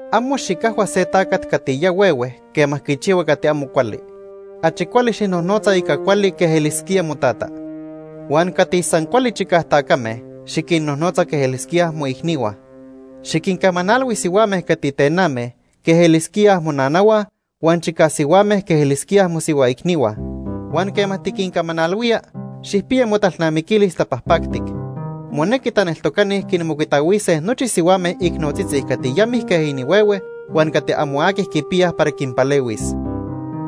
Amo xicajhua se tacat cati ya huehue quema quichihua cati amo cuali. Achi cuali xijnojnotza ica cuali quej elisquía motata. Huan cati san cuali chicaj tacame, xiquinnojnotza quej elisquíaj moicnihua. Xiquincamanalhui sihuame cati tename quej elisquíaj monanahua huan chicaj sihuame quej elisquíaj mosihua icnihua. Huan quema tiquincamanalhuía, xijpiya motalnamiquilis tapajpactic. Monequi taneltocani quinmocuitahuise nochi sihuame icnotzitzi cati ya mijque inihuehue huan cati amo aqui quipiyaj para quinpalehuis.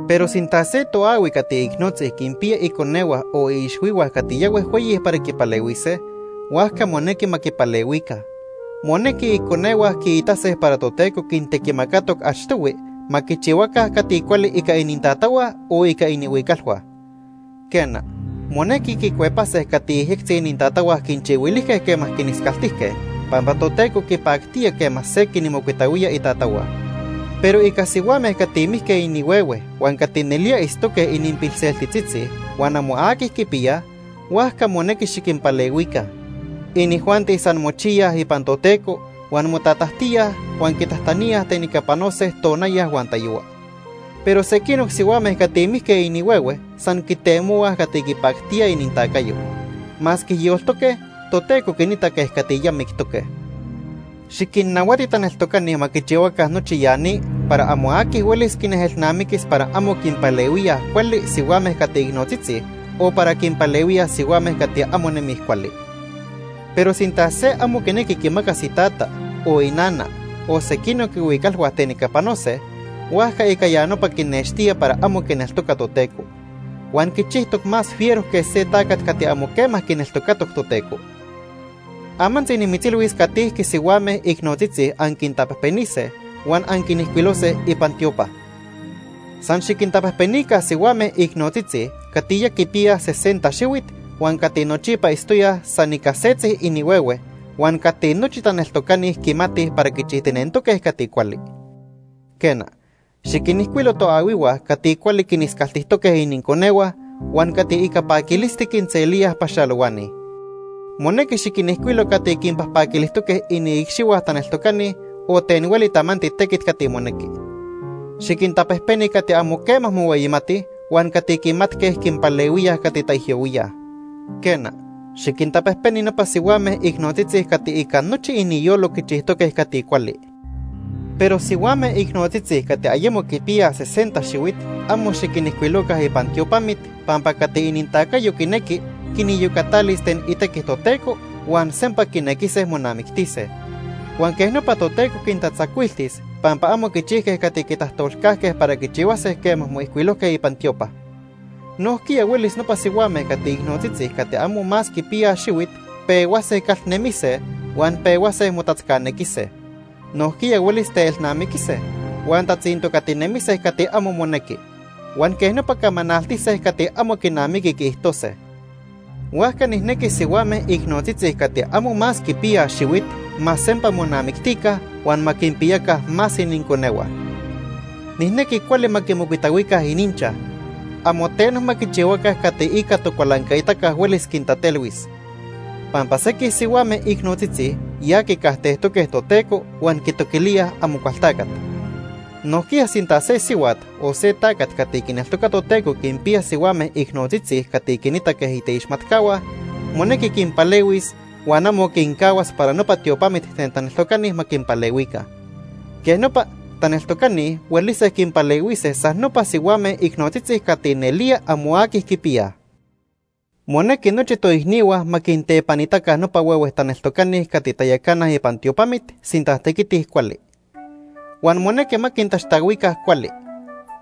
Pero sinta se toahui cati icnotzi quinpiya iconehua o iixhuihua cati ya huejhueyi para quipalehuise, huajca monequi ma quipalehuica. Monequi iconehua quiitase para Toteco quintequimacatoc achtohui ma quichihuaca cati cuali ica inintatahua o cati itztoque inihuicalhua. Quena, monequi quicuepilise cati yejyectzi inintatahua quinchihuilijque quema quiniscaltijque, pampa Toteco quipactía quema se quinmocuitahuía itatahua. Pero ica sihuame cati mijque inihuehue huan cati nelía itztoque ininpilseltitzitzi huan amo aqui quipiyaj, huajca monequi xiquinpalehuica. Inijuanti san mochiyaj ipan Toteco huan motatajtíaj huan quitajtaníaj ten ica panose tonaya huan tayohua. Pero sequinoc sihuame cati mijque inihuehue san quitemohuaj cati quipactía inintacayo. Masque yoltoque, Toteco quinita quej cati ya mictoque. Xiquinnahuati taneltocani ma quichihuaca nochi ya ni para amo aqui huelis quinejelnamiquis para amo quinpalehuíaj cuali sihuame cati icnotzitzi o para quinpalehuíaj sihuame cati amo nemij cuali. Pero sinta se amo quinequi quimacas itata, o inana, o sequinoc ihuicalhua ten ica panose, huajca ica ya nopa quinextía para amo quineltoca Toteco. Huan quichijtoc más fiero que se tacat cati amo quema quineltocatoc Toteco. Amantzi nimitzilhuis catijque sihuame icnotzitzi anquintapejpenise huan anquinijcuilose ipan tiopa. San xiquintapejpenica sihuame icnotzitzi cati ya quipiyaj sesenta xihuit huan cati nochipa itztoyaj san ica setzi inihuehue, huan cati nochi taneltocani quimatij para quichijtinentoque cati cuali. Quena, xiquinijcuilo toahuihua cati cuali quiniscaltijtoque ininconehua huan cati ica paquilisti quinselíaj paxalohuani. Monequi xiquinijcuilo cati quinpajpaquilijtoque iniicxihua taneltocani o ten hueli tamanti tequit cati monequi. Xiquintapejpeni cati amo quema mohueyimatij huan cati quimatque quinpalehuíaj cati taijyohuíaj. Quena, xiquintapejpeni nopa sihuame icnotzitzi cati ica nochi iniyolo quichijtoque cati cuali. Pero sihuame icnotzitzi cati ayemo quipiyaj sesenta xihuit amo xiquinijcuiloca ipan tiopamit, pampa cati inintacayo quinequi, quiniyocatalis ten itequi Toteco huan sempa quinequise monamictise. Huan quej nopa Toteco quintatzacuiltis pampa amo quichijque cati quitajtolcajque para quichihuase quema moijcuilojque ipan tiopa. Nojquiya huelis nopa sihuame cati icnotzitzi cati amo más quipiyaj xihuit pehuase calnemise huan pehuase motatzcanequise. Nojquiya huelis teelnamiquise, huan tatzintocatinemise cati amo monequi. Huan quej nopa camanaltise cati amo quinamiqui quiijtose. Huajca nijnequi sihuame icnotzitzi cati amo más quipiyaj xihuit ma sempa monamictica huan ma quipiyaca más ininconehua. Nijnequi cuali ma quimocuitahuica ininchaj. Amo teno ma quichihuaca cati ica tocualancaitaca huelis quintatelhuis. Pampa sequij sihuame icnotzitzi ya quicajtejtoque Toteco huan quitoquilíaj Amocualtacat. Nojquiya sinta se sihuat o se tacat cati quineltoca Toteco quinpiya sihuame icnotzitzi cati quinita quej iteixmatcahua, monequi quinpalehuis huan amo quincahuas para nopa tiopamit ten taneltocani ma quinpalehuica. Quej nopa, taneltocani huelise quinpalehuise san nopa sihuame icnotzitzi cati nelía amo aqui quipiyaj. Monequi nochi toicnihua ma quintepanitaca nopa huehue taneltocani cati tayacanaj ipan tiopamit sinta tequitij cuali. Huan monequi ma quintaxtahuica cuali.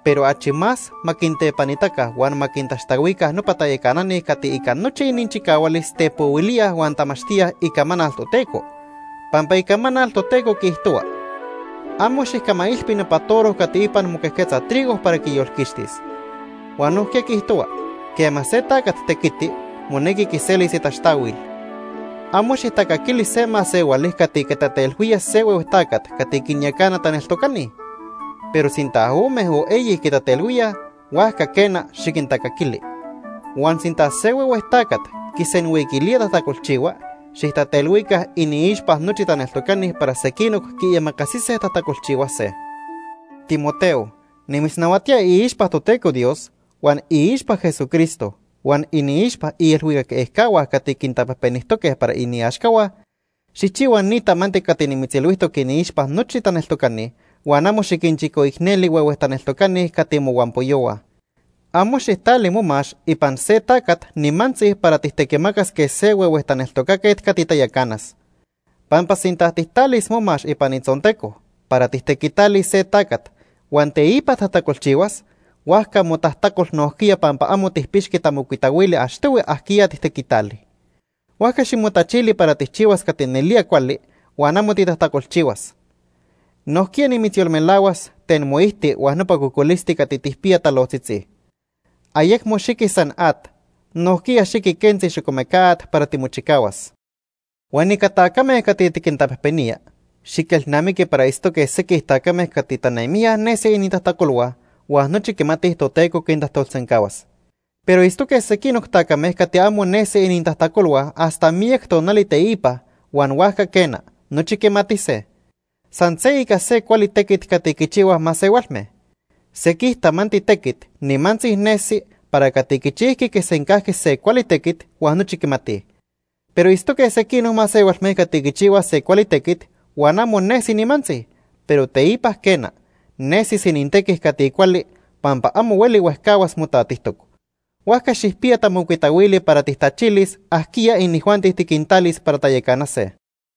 Pero achi más ma quintepanitaca huan ma quintaxtahuica nopa tayacanani cati ica nochi ininchicahualis tepohuilíaj huan tamachtíaj Icamanal Toteco, pampa Icamanal Toteco quiijtohua: “Amo xijcamailpi nopa toro cati ipan moquejquetza trigo para quiyolquixtis.” Huan nojquiya quiijtohua: “Quema se tacat tequiti, monequi quiselis itaxtahuil.” Amo xijtacaquili se masehuali cati quitatelhuía se huehue tacat cati quinyacana taneltocani. Pero sinta ome o eyi quitatelhuíaj, huajca quena, xiquintacaquili. Huan sinta se huehue tacat quisenhuiquilía tajtacolchihua, xijtatelhuica iniixpa nochi taneltocani para sequinoc quiimacasise tajtacolchihuase. Timoteo, nimitznahuatía iixpa Toteco Dios, huan iixpa Jesucristo, huan iniixpa iilhuicac ejcahua cati quintapejpenijtoque para iniaxcahua, xijchihua ni tamanti cati nimitzilhuijtoc iniixpa nochi taneltocani huan amo xiquinchicoicneli huehue taneltocani cati mohuampoyohua. Amo xijtali momax ipan se tacat nimantzi para tijtequimacas quej se huehue taneltocaquet cati tayacanas. Pampa sinta tijtalis momax ipan itzonteco para tijtequitalis se tacat huan teipa tajtacolchihuas, huajca motajtacol nojquiya pampa amo tijpixqui tamocuitahuili achtohui ajquiya tijtequitali. Huajca ximotachili para tijchihuas cati nelía cuali huan amo titajtacolchihuas. Nojquiya nimitzyolmelahuas ten moijti huan nopa cocolisti cati tijpiya talojtzitzi. Ayecmo xiqui san at, nojquiya xiqui quentzi xocomeca at para timochicahuas. Huan ica tacame cati tiquintapejpenía, xiquelnamiqui para itztoque sequij tacame cati tanemijya nesi inintajtacolhua huan nochi quimatij Toteco quintajtolsencahuas. Pero itztoque sequinoc tacame cati amo nesi inintajtacolhua hasta miyac tonali teipa huan huajca quena, nochi quimatise. San se ica se cuali tequit cati quichihuaj masehualme. Sequij tamanti tequit nimantzi nesi para cati quichijqui quisencajqui se cuali tequit huan nochi quimatij. Pero itztoque sequinoc masehualme cati quichihuaj se cuali tequit huan amo nesi nimantzi, pero teipa quena, nesis inintequi cati cuali pampa amo hueli huejcahuas motatijtoc. Huajca xijpiya tamocuitahuili para tijtachilis ajquiya inijuanti tiquintalis para tayacanase.